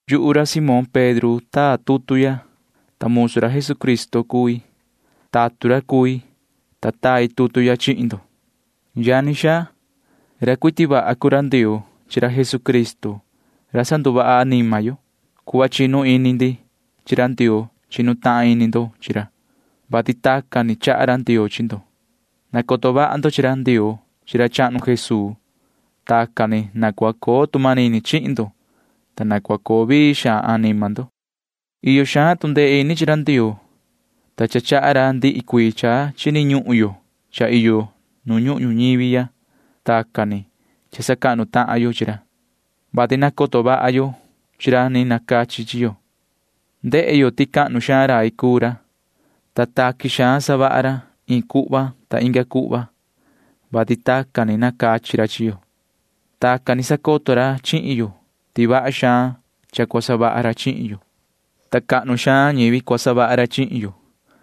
Yuhu ra Simón Pedro taa tutu ya, ta musu ra Jesucristo cui. Tatun ra cui, ta tai tutu ya chihin ndo, yani xaa. Ra cuiti vaha cuu ra Ndioo chi ra Jesucristo ra sanduvaha anima yo. Cuhva chinu ini ndi chi ra Ndioo chinu tahan ini ndo chi ra, vati tacan ni chaha ra Ndioo chi ndo. Nacoto vaha ndo chi ra Ndioo chi ra chahnu Jesuu. Tacan ni na cua coo tu manini chihin ndo, ta na cua coo vii xaan anima ndo. Iyo xaan tu ndee ini chi ra Ndioo, ta cha chaha ra ndihi cuii cha chini ñuhun yo cha iyo yo nu ñuhun ñuñivi. Tacan ni cha sacahnu tahan yo chi ra, vati nacoto vaha yo chi ra ni nacachi chi yo. Ndehe yo ti cahnu xaan rai cuu ra, ta taqui xaan savaha ra iin cuhva inga cuhva, vati tacan ni nacachi ra chi yo. Tacan ni sacoto ra chihin yo ti vaha xaan cha cua savaha ra chihin yo, ta cahnu xaan ñivi cua savaha ra chihin yo.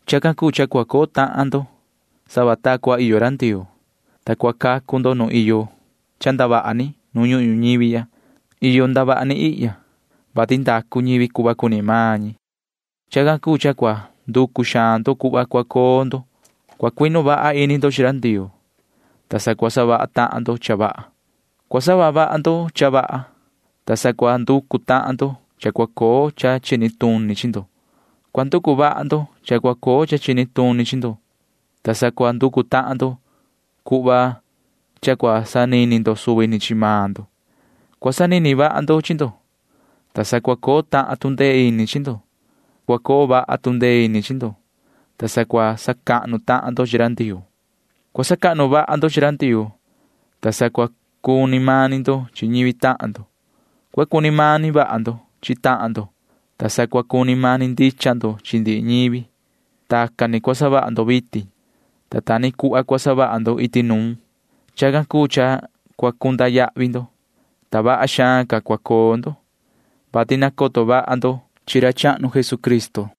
Chacan cuu cha cua coo tahan ndo sava ta cua iyo ra Ndioo, ta cua cacu ndo nu iyo cha ndavaha ni nu ñuhun ñuñivi ya. Iyo ndavaha ni ihya, vati ndacu ñivi cuhva cuni maan ñi. Chacan cuu cha cua nanducu xaan ndo yoso cuhva cua coo ndo. Cua cuinu vaha ini ndo chi ra Ndioo, ta sa cua savaha tahan ndo cha vaha. Cua savaha vaha ndo cha vaha, ta sa cua nducu tahan ndo cha cua coo cha chini tuni chi ndo. Cua nducu vaha ndo cha cua coo cha chini tuni chi ndo, ta sa cua nducu tahan ndo cuhva cha cua sanini ndo suvi ni chi maan ndo. Cua sanini vaha ndo chi ndo, ta sa cua coo tahan tu ndee ini chi ndo. Cua coo vaha tu ndee ini chi ndo, ta sa cua sacahnu tahan ndo chi ra Ndioo. Cua sacahnu vaha ndo chi ra Ndioo, ta sa cua cuni mani ndo chi ñivi tahan ndo. Cua cuni mani vaha ndo chi tahan ndo, ta sa cua cuni mani ndicha ndo chi ndihi ñivi. Tacan ni cua savaha ndo vitin, ta ta ni cuhva cua savaha ndo iti nuun. Chacan cuu cha cua cunda yahvi ndo, ta vaha xaan ca cha cua coo ndo, vati nacoto vaha ndo chi ra chahnu Jesucristo.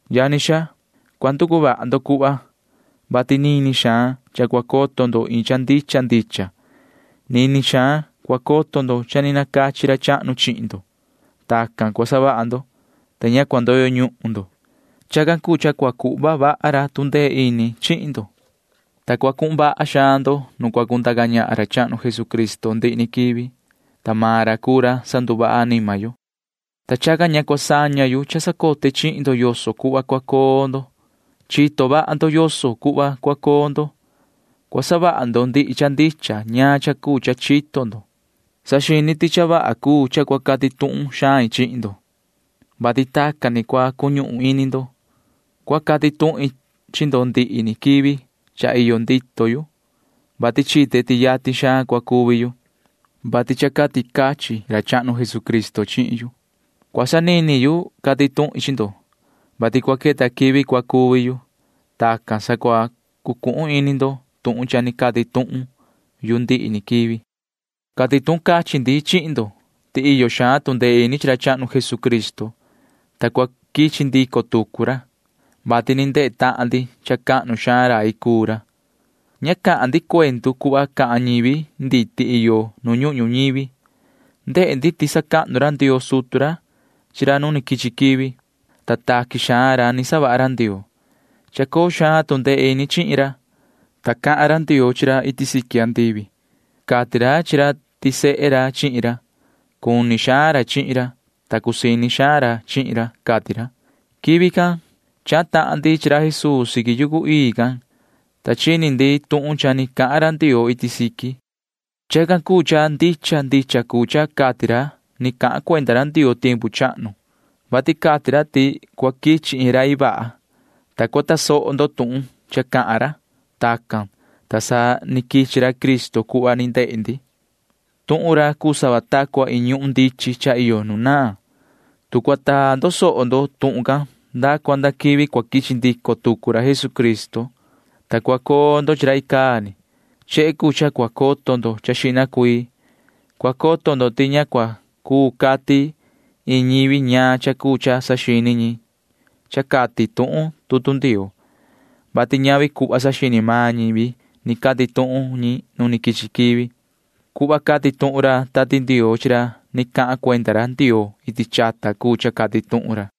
Yani xaa, cua nducu vaha ndo cuhva, vati nini xaan cha cua coto ndo iin cha ndicha ndicha. Nini xaan cua coto ndo ti cha ni nacachi ra chahnu chihin ndo. Tacan cua savaha ndo, ta ña cua ndoyo ñuhun ndo. Chacan cuu cha cua cuhva vaha ra tu ndee ini chihin ndo, ta cua cuhun vaha xaan ndo nu cua cundaca ñahan ra chahnu Jesucristo ndihi ni quivi, ta maan ra cuu ra sanduvaha anima yo. Chacan cuu cha ndihi ni quivi cua sacoto ndico tuqui yoso cuhva cua coo ndo. Chito vaha ndo yoso cuhva cua coo ndo, ta cua savaha ndo ndihi cha ndicha ñaan cha cuu cha chito ndo. Yuhu saxini ti cha vaha cuu cha cua cati tuhun xain chihin ndo, vati tacan ni cua cuñuhun ini ndo. Cua cati tuhin chi ndo ndihi ni quivi cha iyo ndito yu, vati chite ti yatin xaan cua cuvi yu, vati tacan ni cati cachin ra chahnu Jesucristo chihin yu. Cua sanini yu cati tuhin chi ndo, vati cua queta quivi cua cuvi yu. Tacan sa cua cuñuhun ini ndo tuhun cha ni cati tuhun yu ndihi ni quivi. Cati tuhun cachin ndi chihin ndo ti iyo xaan tu ndee ini chi ra chahnu Jesucristo, ta cua quichi ndico tucu ra, vati ni ndehe tahan ndi ti cha cahnu xaan rai cuu ra. Ña cahan ndi cuendu cuhva cahan ñivi nditi iyo nu ñuhun ñuñivi. Ndehe ndi ti sacahnu ra Ndioo sutu ra chi ra nu quichi quivi, ta taqui xaan ra cha cuu savaha ra Ndioo. Chacoo xaan tu ndee ini chihin ra, ta cahan ra Ndioo chi ra iti siqui andivi. Cati ra chi ra ti sehe ra chihin ra. Cuni xaan ra chihin ra, ta cusii ini xaan ra chihin ra, cati ra. Quivi can chahan tahan ndi chi ra Jesuu siqui yucu ii can, ta chini ndi tuhun cha ni cahan ra Ndioo iti siqui. Chacan cuu cha cha ndicha ndicha cuu cha cati ra ni cahan cuenda ra Ndioo tiempu chahnu, vati cati ra ti cua quichi iin rai vaha, ta cua tasoho ndo tuhun cha cahan ra. Tacan, ta sa ni quichi ra Cristo cuhva ni ndehe ndi. Tuhun ra cuu sava ta cua iin ñuhun ndichin cha iyo nu naan, ta cua taa ndo soho ndo tuhun can nda cua nda quivi cua quichi ndico tucu ra Jesucristo, ta cua coo ndo chi ra icaa ni. Chehe cuu cha cua coto xihna ndo. Cua coto ndo ti ña cua cuu cati iin ñivi ñaan cha cuu cha saxini maan ñi cha cati tuhun tutu Ndioo, vati ñavi cuhva saxini maan ñivi cati tuhun ñi nu ni quichi quivi. Cuhva cati tuhun ra Tati Ndioo chi ra ni cahan cuenda ra Ndioo iti chata cuu cha cati tuhun ra.